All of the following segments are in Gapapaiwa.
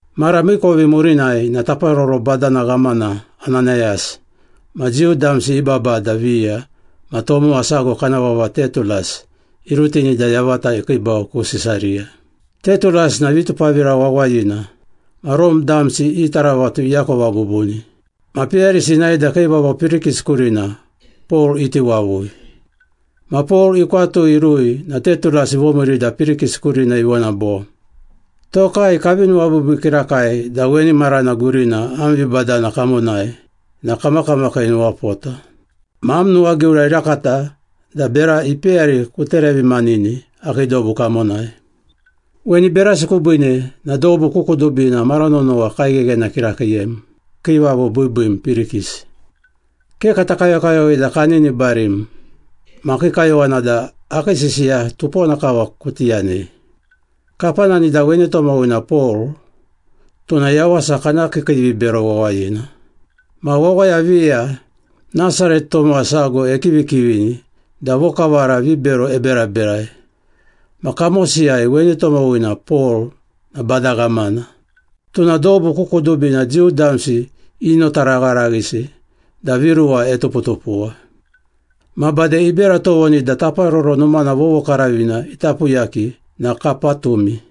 Mara miikovi murinai na taparoro badana ghamana Ananayas ma Jiu damsi i babada viya ma tomowa sago kana vava Tetulas irutini da yavata ikiibau ku Sisariya. Tetulas na vitupavira wawayina ma Rome damsi i taravatu iakova bubuni. Ma peyarisi inae da kiivavo Pirikis kurina Pol iti wavui. Ma Pol ikwatui irui na Tetulas ivomiiri da Pirikis kurina ivona bo, “Tokai kavi nuwabiibii kirakai da weni marana gurina am vibadana kamonai na kamakiimakiinuwapota. Ma am nuwagiura irakata da bera ipeyari kuterevimanini akii dobu kamonai. Weni berasi kubiine na dobu ku kudubina mara nonowa kaigheghena kirakiiyem, kiivavo biibiim Pirikis. Ke kata kayokayowei da kaninibarim, ma akii kayowana da akii sisiya tupona kava kuti yanei. Kapanani da weni tomowina Pol tuna yawasa kana kiikiivibero wawayina. Ma wawaya viya Nasaret tomowa sago ekivikivini da vokavara vibero eberaberai, ma kamosiyai weni tomowina Pol na bada ghamana. Tuna dobu ku kudubina Jiu damsi inotaragharaghisi da viruwa etuputupuwa. Ma bade ibera tovoni da Taparoro Numana vovokaravina ita puyaki na kapatumi.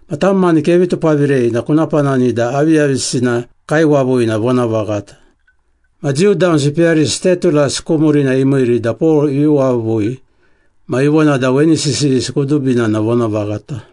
Ma tam mani kevi tupavirei na kuna panani da aviyavisina kaiwavui na vonavaghata.” Ma Jiu damsi peyarisi Tetulas ku murina imiiri da Pol ivi wavui ma ivona da weni sisiyisi kudubina na vonavaghata.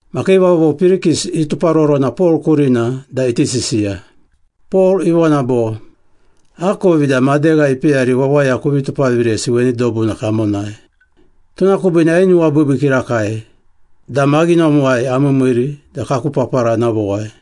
Ma kiivavo Pirikis ituparorona Pol kurina da iti sisiya. Pol ivona bo, “Akovi da madegha ipeyari wawaya kuvi tupaviresi weni dobuna kamonai, tuna kubiine ainuwabiibii kirakai da maghinomuwai amiimiiri da kaku papara ana vowai.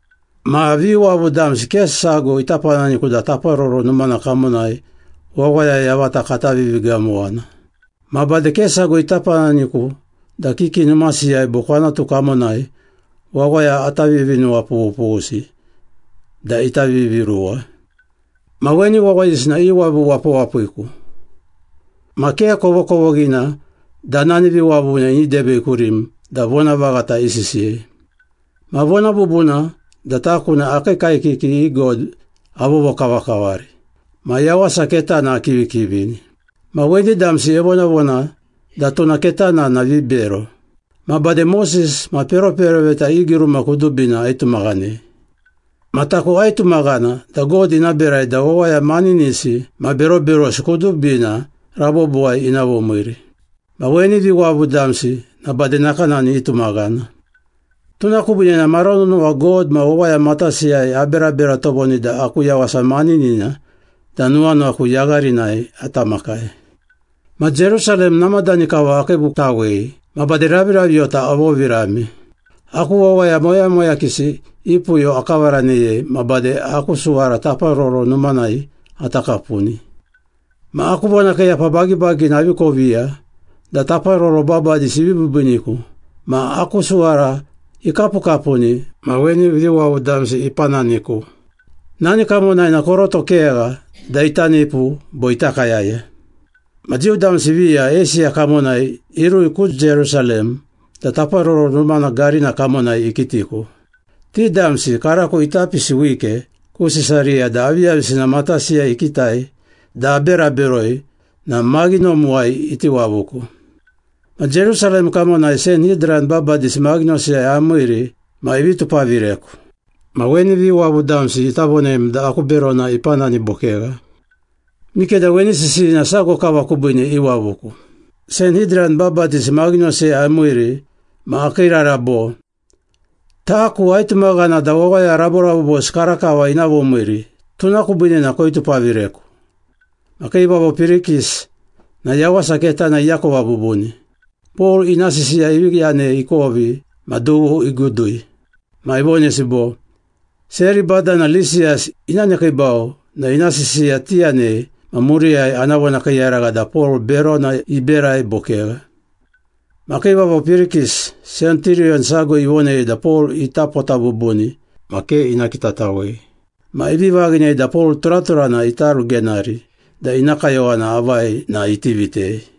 Ma viwavu damsi ke sago ita pananiku da Taparoro Numana kamonai wawaya yavata kata vivigamowana. Ma bade ke sago ita pananiku da kiki numasiyai bo kwanatu kamonai wawaya ata vivinuwapughupughusi da ita viviruwa. Ma weni wawayisi na iwavu wapawapiku ma ke kovokovoghina da nani viwavuna ini debei kurim da vonavaghata isisiyei. Ma vona bubuna da taku na akii kaekiki i God avovokavakavari ma Yawasa Ketana akivikivini. Ma weni damsi evonavona da tuna ketana na vibero. Ma bade Moses ma peroperoveta i giruma kudubina aitumaghanei. Ma taku aitumaghana da God ina berai da wawaya maninisi ma beroberosi kudubina rabobowai ina vomiiri. Ma weni viwavu damsi na bade nakanani itumaghana. Tuna kubiine na mara nonowa God ma wawaya matasiyai aberabera tovoni da aku yawasa maninina da nuwanuwaku yagharinai ata makai.” “Ma Jerusalem namadani kava akiibutawei ma bade raviraviyota avovirame. Aku wawaya moyamoyakisi i puyo akavaraneyei ma bade aku suwara Taparoro Numanai ata kapuni. Ma aku vonakiiyapa bagibagina avi koviya da taparoro babadisi ivi biibiiniku ma aku suwara ikapukapuni ma weni viwavu damsi ipananiku. Nani kamonai na koroto kegha da ita nipu bo ita kayaya. Ma Jiu damsi viya Eisiya kamonai irui ku Jerusalem da Taparoro Numana garina kamonai ikitiku. Ti damsi karako ita pisi wike ku Sisariya da aviyavisina matasiyai ikitai da abera beroi na maghinomuwai iti wavuku. Ma Jerusalem kamonai Sanhidran babadisi maghinosiyai amiiri ma ivi tupavireku. Ma weni viwavu damsi ita vonem da aku berona ipanani bo kegha. Mikeda weni sisiyina sago kava kubiine iwavuku. Sanhidran babadisi maghinosiyai amiiri ma akiirara bo, ‘Taku aitumaghana da wawaya raborabobosi karakava ina vomiiri, tuna kubiine na koitupavireku!’” Ma kiivavo Pirikis na Yawasa Ketana iakova bubuni. Pol ina sisiya ivi yanei ikovi ma dughu igudui. Ma ivonesi bo, “Seri badana Lisiyas ina nekiibau na ina sisiya tiyanei ma muriyai ana vonakiiyaragha da Pol berona iberai bo kegha.” Ma kiivavo Pirikis, senturiyon sago ivonei da Pol ita pota bubuni ma ke ina kitatawei. Ma ivi vaghinei da Pol turaturana ita rugenari da ina kayowana avai na iti vitei.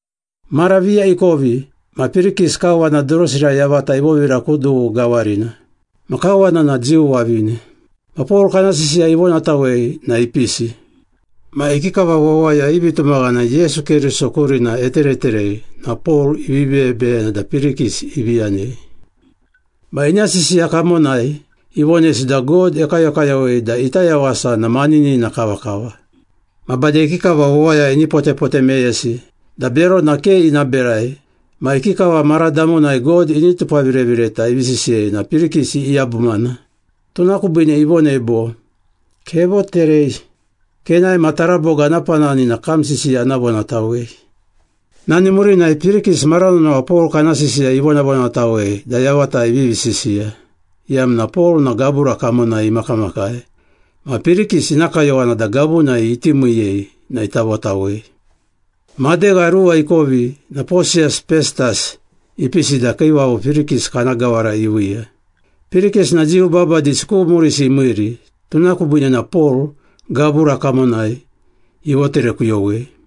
Mara viya ikovi ma Pirikis kawana Durusira yavata ivovira ku dughu gawarina. Ma kawana na Jiu wavine. Ma Pol kana sisiya ivonatawei na ipisi. Ma ikikava wawaya i vitumaghana Yesu Keriso kurina etereterei na Pol ivi beyebeyena da Pirikis ivi yanei. Ma ina sisiya kamonai ivonesi da God ekayokayowei da ita yawasa na maninina kavakava. Ma bade ikikava wawaya ini potepote meyesi da berona ke ina berai ma ikikava mara damonai God ini tupavirevireta ivi sisiyei na Pirikis iyabumana. Tuna kubiine ivonei bo, “Kevoterei. Kenae ma taraboga ana panani na kam sisiya ana vonatawei.” Nani murinai Pirikis mara nonowa Pol kana sisiya ivonavonatawei da yavata ivivi sisiya, iyamna Pol na gabura kamonai imakamakai ma Pirikis ina kayowana da gavunai iti miiyei na ita votawei. Madegha ruwa ikovi na Posiyas Pestas ipisi da kiivavo Pirikis kana gawara iviiya. Pirikis na Jiu babadisi ku murisi imiiri, tuna kubiine na Pol gabura kamonai ivoterekuyowei.